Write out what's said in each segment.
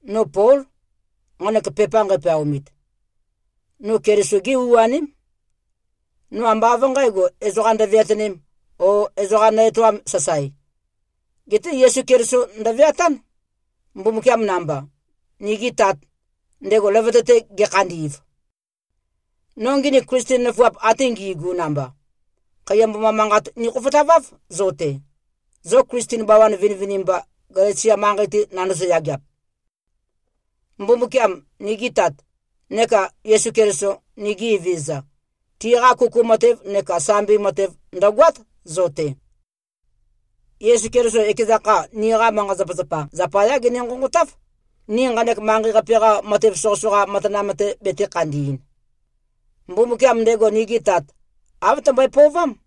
No Pól, nqanek pepa nqæpeaumit. No Keliso-gé u-aném. No ambá av nqǣgo, ezoqa ndøveatønēm o ezoqa nø-etoām, sasae. Geté Yesu Keliso ndøveatán, Mbumbukiam namba, nigi Tat, ndego løvøte-te gekhandi꞉v. No nginik Klisten nøfuap ate ngi꞉gu namba, khaiya mboma manqat nikhofotaváv zo-te, zo Klisten bawan vinivinimba, Galesia manqei-te nandozo-yageap. Mbumbukiam, nigi Tat, neka Yesu Keliso, nigi Evezøza, tiqa kuku matev neka sambi matev ndø̀goát, zo-te. Yesu Keliso, ekeza kha, niqa manqa-zapazapa zapayá gene-nqonqotáv, ni nqanek manqei-qape-qa matev soqøsoqa matanam-te betē-khandi꞉n. Mbumbukiam, ndego nige Tat, āv tømbøe-pøovám.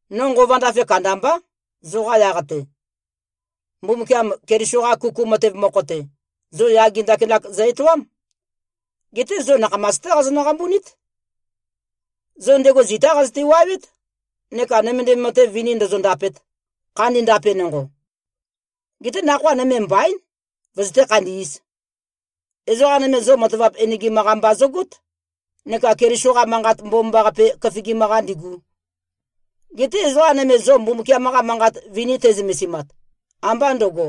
No nqova ndafe kandambá, zoqa yaq-te. Mbumbukiam Keliso-qa kuku matev mokho-te, zo yage ndakinak zø-etoám. Geté zo nakhamas-té qazonø-qambunít. Zo ndego zitá qazøte-wuawét, neka nømendim matev vini ndōzōndāpēt, khandi ndape nonqo. Geté nakhoa nøme mbaín, vøzøté-khandī꞉z. Ezoqa nøme, zo matavap enegim-qa mba zøgót, neka Keliso-qa Manqat Mbomambaqape køfigim-qa ndīḡū. Geté ezoqa nøme zo Mbumbukiam-qa Manqat vini te꞉zømesimat, ambá ndø̄go,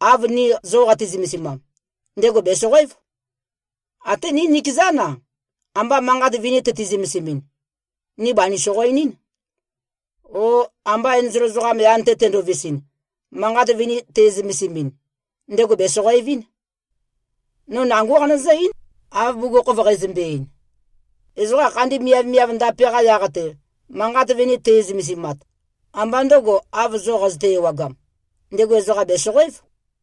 av ni zo qati-zømesimam, ndego bèsoqoév. Até ni nikezán-a, amba manqat vini tøti-zømesimɨn, ni banī-soqoenɨn, o amba enzol ezoqam yan-te tendovisɨn, manqat vini te꞉zømesimɨn, ndego bēsoqoevɨn. No nangó qanøzǿ-eín, av bugukhokhof qeizømbe-ein. Ezoqa khandi miavmiav ndape-qa yaq-te, manqat vini te꞉zømesimat, ambá ndø̄go, av zo qazøte-ewagam, ndego ezoqa bèsoqoév.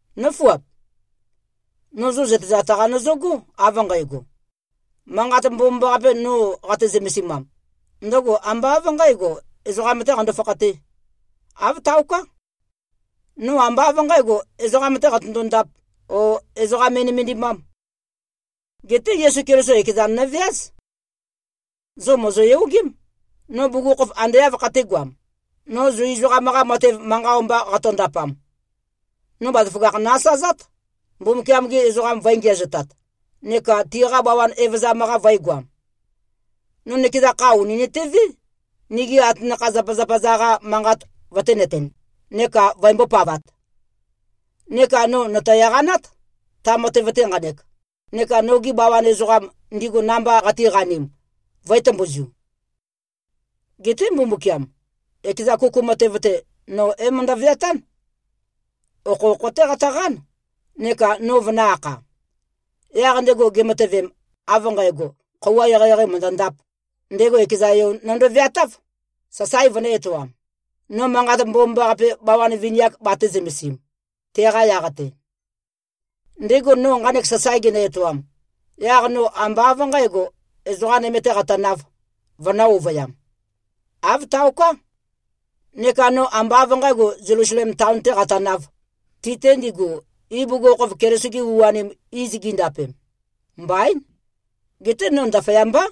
Nǿfuap! No zo zøtezat-qa nøzøgó, av nqægo: Manqat Mbomambaqape, no zo qate-zømesimam, ndøgo ambá av nqǣgo, ezoqam-tē qando-fakhatē. Āv taoká. No ambá av nqǣgo, ezoqam-tē qatøndo-ndāp, o ezoqa me꞉nømendimām. Geté Yesu Keliso ekezan nøveáz. Zo mòzoyogém, no bugukhokhof ande āv khatēgoam, no Zu ezoqam-qa matev manqa o-mba qatondapam. No bazaføgakh nø-asazát, Mbumbukiam-gi ezoqam vø̄e-ngiæzotat, neka tiqa bawan evøzam-qa vø̄egoam. No nøkeza kha ùni nøtevé, nigi atanakha-zapazapa-za-qa manqat vøténøtēn neka vøembó-pavāt. Neka no nòto-eqanát, ta matev-te nqanek, neka nogi bawan ezoqam, ndigu namba qatiqanim, vø̄e-tømbuzu. Geté Mbumbukiam, ekeza kuku matev-te, no é-møndø-veatán. Okhokho-té qatøqán, neka no vønø̄-akha. Yaq ndego gematøvem, av nqægo, khøuwa eqeieqei mø̀ndøndāp, ndego ekeza Yo nøndo-veatáv, sasae vønø̄-etoam, no Manqat Mbomambaqape, bawan vini-ak batē-zømesim, teqa yaq-te. Ndego no nqanek sasae genø-etoam, yaq no ambá av nqǣgo, ezoqa nøme-tē qatønāv, vønǿ-ovøyām. Āv taoká. Neka no ambá av nqǣgo, Zelusalem taon-tē qatønāv, ti-te ndigu, ibugukhokhof Keliso-gi u-anim iz gindapem. Mbaín. Geté no ndaføyambá,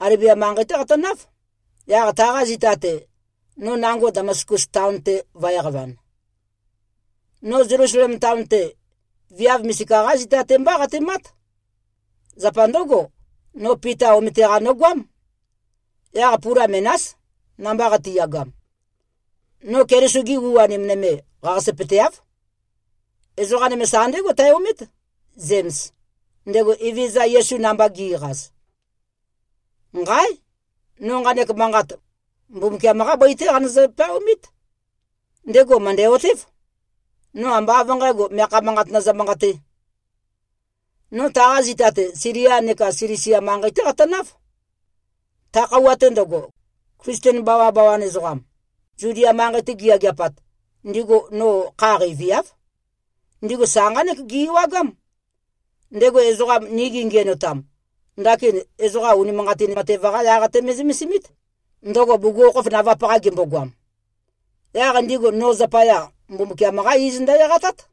Alebia manqei-té qatønáv, yaq taqa zita-te, no nango Damaskus taon-te vø̄e-qavan. No Zelusalem taon-te, viav misika-qá zita-te mbá qatemát. Zapa ndǿgo, no Pita omete-qa nogoám. Yaq pula menás, namba qatiyagam. No Keliso-gi u-anim nøme, qaqasøpøteáv. Ezoqa nøme sa ndégo tæ-omét, Zems, ndego Evezøza Yesu namba gi꞉qaz. Nqáe! No nqanek manqat, Mbumbukiam-qá bøi-té qanøzø-peaomít. Ndego mø̀ndæ-otév. No ambá av nqǣgo, meakha manqat nøzø-manqatē. No taqa zita-te, Silia neka Silisia manqei-té qatønáv. Ta khøuwa-te ndøgo, Klisten bawabawan ezoqam, Zudia manqei-te giyageapat, ndigu no kha qeiviáv. Ndigu sa nqánek gi-ewagám: Ndego ezoqam, ni gengiænotam, ndakin ezoqa unimanqatin matev-qa yaq-te me꞉zømesimít, ndøgo bugukhokhof navap-qa gembogoam. Yaq ndigu no zapaya, Mbumbukiam-qá iz ndø-eqatát.